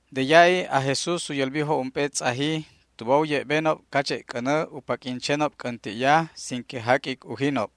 De ya'i aj Jesús u yälbijob ump'e tz'aji tuba u ye'benob cache' c'änä u paq'uin chenob c'änti'ya sin que jaq'uic ujinob.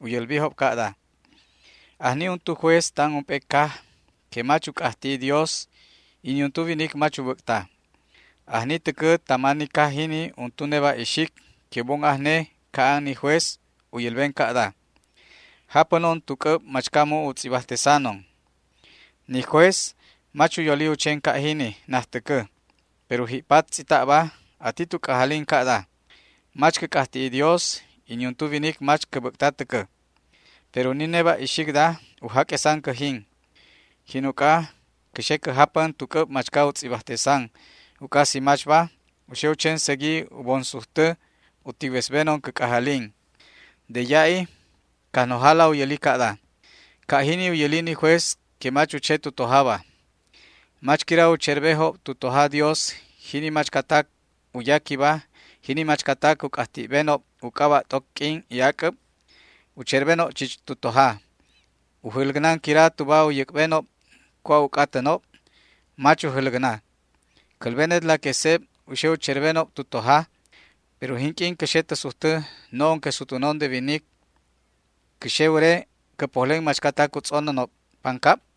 U yälbijob ca'da: ―Ajni untu juez tan ump'e caj que mach u c'ajti'i Dios y niuntu winic mach u bäc'ta. Ajni täcä tama ni caj jini untu neba' ixic que u bon ajne ca'an ni juez u yälben ca'da: “Japänon tu c'äb machca mu' u tz'ibajtesanon”. Ni juez mach u yoli u chen ca' jini najtäcä, pero ji'pat tz'ita'ba ati tu c'ajalin ca'da: “Mach cä c'ajti'i Dios y niuntu winic mach cä bäc'ta täcä. Pero ni neba' ixicda u jaq'uesan cäjin. Jin uc'a cä xe cä japän tu c'äb machca u tz'ibajtesan, uc'a si machba, u xe u chen segui u bon sujtä u ticwesbenon cä c'ajalin”. De ya'i Cajnojala u yäli ca'da: ―Ca' jini u yäli ni juez que mach u che tu tojaba. ¿Mach quira u cherbejob tu toja Dios jini machcatac u yaquiba, jini machcatac u c'ajti'benob u c'aba' t'oc q'uin y ac'äb? U cherbenob chich tu toja. ¿U jäläcnan quira tuba u yäc'benob cua' u c'atänob? Mach ujäläcna. Cälbenetla que seb u xe u cherbenob tu toja. Pero jinq'uin cä xe tä sujtä, no'on que sutwänon de winic, ¿cä xe wäre cä pojlen machcatac u tz'onänob pancab?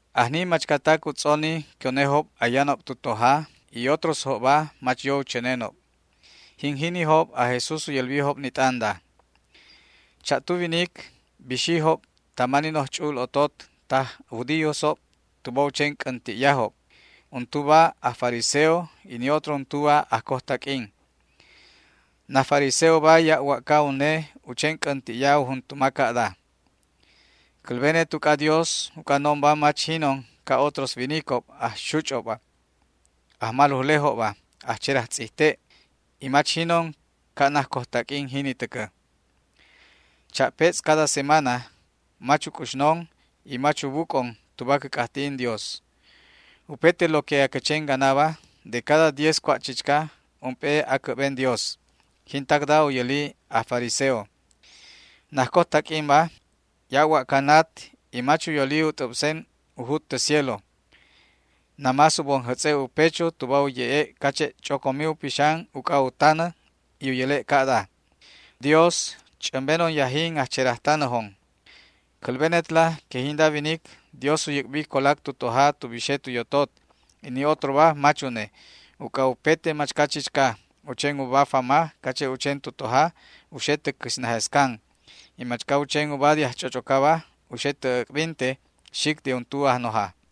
Ajni yebejob machcatac u tz'onijob que unejob ayanob tu toja, y otrosjobba mach yo u chänenob. Jin jinijob aj Jesús u yälbijob ni t'anda: ―Cha'tu winic bixijob tama ni noj ch'u'ul otot taj judíosob tuba u chen c'änti'yajob. Untuba aj fariseo y ni otro untuba ajcojtaq'uin. Naj fariseoba ya' wa'ca une u chen c'änti'ya u juntuma ca'da: “Cälbenet uc'adios uc'a no'onba mach jinon ca' otros winicob, ajxuch'obba, ajmalujlejobba, ajcherajtz'ijte'ba, y mach jinon ca' najcojtaq'uin jini täcä. Cha'petz' cada semana mach uc'uxnon y mach ubuc'on tuba cä c'ajti'in Dios. Upete lo que acä chen ganaba, de cada diez cua' chichca, ump'e acä'ben Dios”. Jintacda u yäli naj fariseo. Najcojtaq'uinba ya' wa'ca nat y mach u yoli u t'äbsen u jut tä cielo. Namás u bon jätz'e' u pecho tuba u ye'e' cache' ch'ocomi u pixan uc'a u tanä, y u yäle' ca'da: “¡Dios, ch'ämbenon yajin ajcherajtanäjon!” Cälbenetla que jinda winic Dios u yäc'bi colac tu toja tu bixe tu yotot, y ni otroba mach une, uc'a upete machca chichca u chen uba fama cache' u chen tu toja u xe tä quisnäjescan y machca u chen uba de ajch'och'ocaba u xe tä äc'binte xic de untu ajnoja.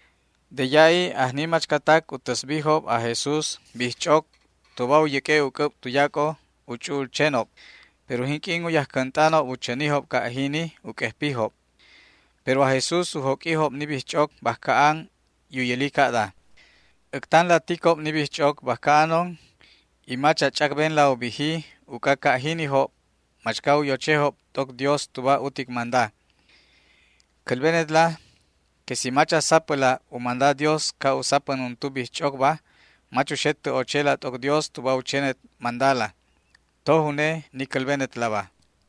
De ya'i ajni machcatac u täsbijob aj Jesús bijch'oc tuba u yäq'ue' u c'äb tuyac'o u ch'u'ul chenob, pero jinq'uin u yajcänt'anob u chänijob ca' jini u q'uejpijob. Pero aj Jesús u joq'uijob ni bijch'oc bajca an y u yäli ca'da: ―Äctanla ticob ni bijch'oc bajca anon y mach a ch'acbenla u biji uc'a ca' jinijob machca u yochejob t'oc Dios tuba utic manda. Cälbenetla que si mach a sapäla u manda Dios ca' u sapän untu bijch'ocba mach uxet tä ochela t'oc Dios tuba u chenet mandala. Toj une ni cälbenetlaba.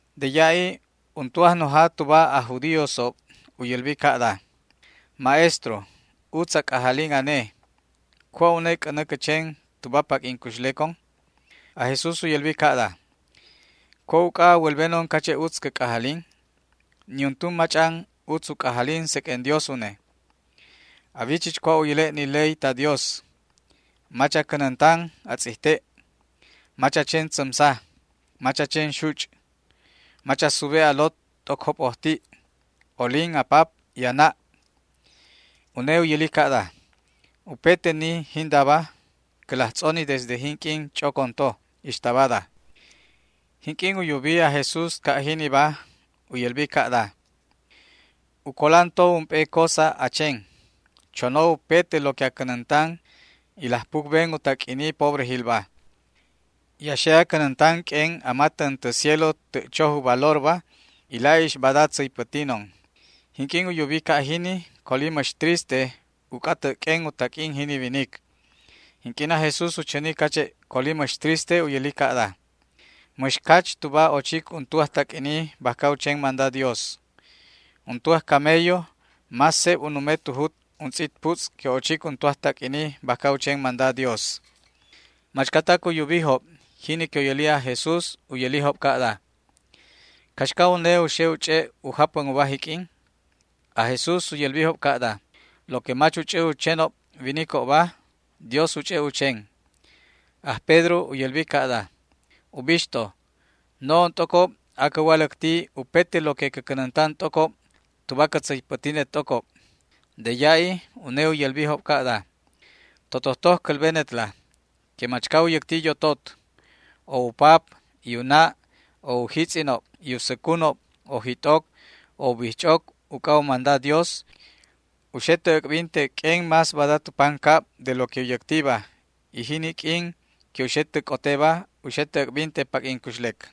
De ya'i untu ajnoja tuba aj judíosob u yälbi ca'da: ―Maestro, utz a c'ajalin ane. ¿Cua' une c'änä cä chen tuba paq'uin cuxlecon? Aj Jesús u yälbi ca'da: ―¿Cua' uc'a a wälbenon cache' utz cä c'ajalin? Niuntu mach'an utz u c'ajalin seq'uen Dios une. A wi chich cua' u yäle' ni ley ta Dios: “Mach a cänäntan a tz'ijte'; mach a chen tzämsa; mach a chen xuch'; mach a sube' a lot t'oc jop'ojti'; olin a pap y a na'”. Une u yäli ca'da: ―Upete ni jindaba cä laj tz'oni desde jinq'uin ch'ocon toba ixta bada. Jinq'uin u yubi aj Jesús ca' jiniba u yälbi ca'da: ―U colan to ump'e cosa a chen: chono upete lo que a cänäntan y laj pucben u taq'uini pobrejilba y a xe a cänäntan q'uen a matän tä cielo tä' choj u valorba, y la'ix bada tzäypätinon. Jinq'uin u yubi ca' jini coli mäx triste uc'a tä' q'uen u taq'uin jini winic. Jinq'uin aj Jesús u chäni cache' coli mäx triste u yäli ca'da: ―¡Mäx cach tuba ochic untu ajtaq'uini bajca u chen manda Dios! Untu ajcamello más seb u nume tu jut untz'it putz' que ochic untu ajtaq'uini bajca u chen manda Dios. Machcatac u yubijob jini que u yäli aj Jesús u yälijob ca'da: ―¿Caxca une u xe u ch'e' u japän uba jiq'uin? Aj Jesús u yälbijob ca'da: ―Lo que mach u ch'ä u chenob winicobba, Dios u ch'e' u chen. Aj Pedro u yälbi ca'da: ―Ubixto, no'on t'ocob acä waläcti upete lo que cä cänäntan t'ocob tuba cä tzäypätinet t'ocob. De ya'i une u yälbijob ca'da: ―Totojtoj cälbenetla que machca u yäcti yotot o u pap y u na', o u jitz'inob y u säcunob, o jit'oc o u bijch'oc uc'a u manda Dios, u xe tä äc'binte q'uen más bada tu pancabba de lo que u yäctiba, y jini q'uin que u xe tä c'oteba u xe tä äc'binte paq'uin cuxlec.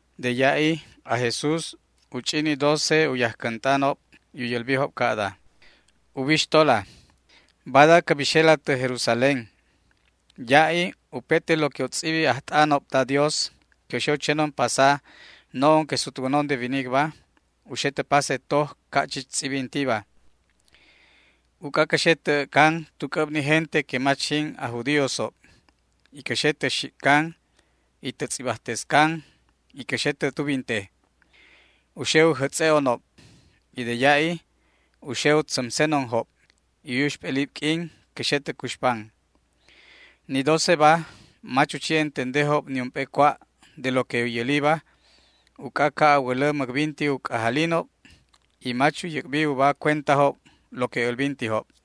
De ya'i aj Jesús u ch'i ni docejob u yajcänt'anob y u yälbijob ca'da: ―Ubixtola, bada cä bixela tä Jerusalén. Ya'i upete lo que u tz'ibijob ajt'anob ta Dios que u xe u chenon pasa no'on que sutwänon de winicba, u xe tä pase toj ca' chich tz'ibintiba. Uc'a cä xe tä äc'can tu c'äb ni gente que mach jin aj judíosob y cä xe tä xic'can y tä tz'ibajtescan y cä xe tä tubinte. U xe u jätz'e'onob y de ya'i u xe u tzämsenonjob y u yuxp'elib q'uin cä xe tä cuxpan. Ni doceba mach u chi entendejob niump'e cua' de lo que u yäliba uc'a ca' a wälä mäcbinti u c'ajalinob, y mach u yäc'bi uba cuentajob lo que älbintijob.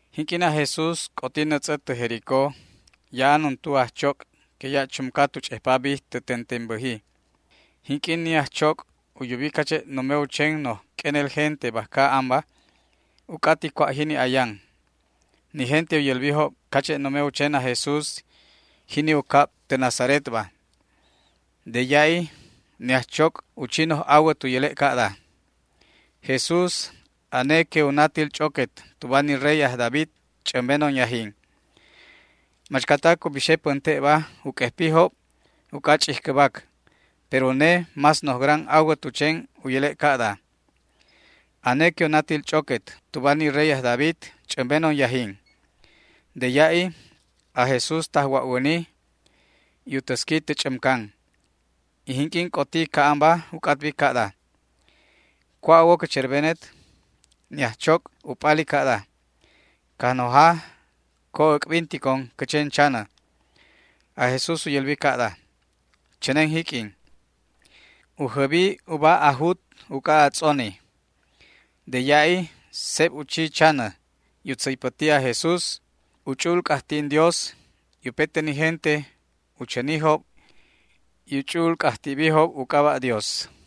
Jinq'uin aj Jesús c'oti nätz'ä tä Jericó ya'an untu ajchoc' que ya' chumca tu ch'ejpa bij tä tentenbäji. Jinq'uin ni ajchoc' u yubi cache' nume u chen noj q'uenel gente bajca anba, u c'ati cua' jini ayan. Ni gente u yälbijob cache' nume u chen aj Jesús, jini u cab tä Nazaretba. De ya'i ni ajchoc' u chi noj awät u yäle' ca'da: ―¡Jesús, ane que u natil ch'oquet tuba ni rey aj David, ch'ämbenon yajin! Machcatac u bixe pänte'ba u q'uejpijob uc'a ch'ijcäbac, pero une más noj gran awät u chen u yäle' ca'da: ―¡Ane que u natil ch'oquet tuba ni rey aj David, ch'ämbenon yajin! De ya'i aj Jesús tajwa'wäni y u täsqui tä ch'ämcan, y jinq'uin c'oti ca'anba u c'atbi ca'da: ―¿Cua' a wo cä cherbenet? Ni ajchoc' u p'ali ca'da: ―Cajnoja, co äc'binticon cä chen chanä. Aj Jesús u yälbi ca'da: ―¡Chänen jiq'uin! U jäbi uba a jut uc'a a tz'oni. De ya'i seb u chi chanä y u tzäypäti aj Jesús u ch'u'ul c'ajti'in Dios, y upete ni gente u chänijob y u ch'u'ul c'ajti'bijob u c'aba' Dios.